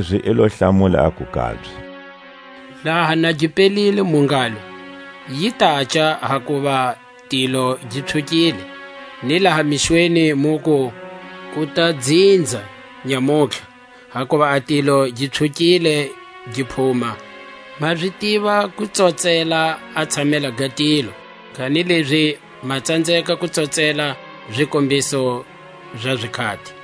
Kanilezi i lo hlamula aku kabye: Laha na gi pelile mu ngalo: Yi taca, hakuva tilo gi pswhukile. Ni laha mixweni muku; Ku ta dzinza nyamutlha; hakuva a tilo gi pswhukile gi phuma. Ma zi tiva ku tsotsela a tshamela ga tilo, kanilezi ma tsanzeka ku tsotsela zikombiso za zikhati.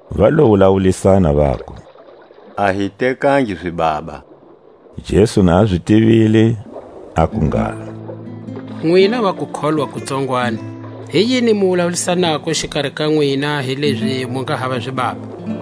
Va lo wulawulisana, vaku; A hi tekangi zibaba. Jesu na a zi tivile, aku ngalo: Nwina va kukholwa ku tsongwani, hi yini mu wulawulisanako xikari ka nwina, hilezi mu nga hava zibaba?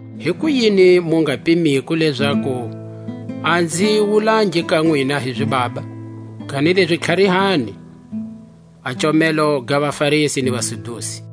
Hikuyini mu nga pimiko lezaku a nzi wulangi ka nwina hi zibaba? Kanilezi tlharihani a comelo ga vaFarisi ni vaSadusi.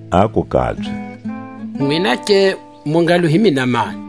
Aku kabye: Nwinake mu ngalo hi mina mani?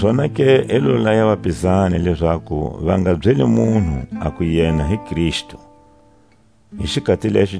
Zonake i lo laya vapizani lezaku va nga byeli munhu aku yena hi Kristu. Jesu a tivisa hi kufa kakwe.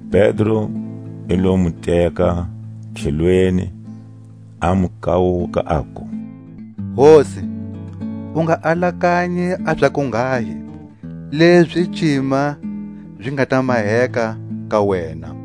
Pedro i lo mu teka tlhelweni, a mu kawuka, aku: Hosi, u nga alakanyi a za kunghahi; lezi cima zi nga ta maheka ka wena.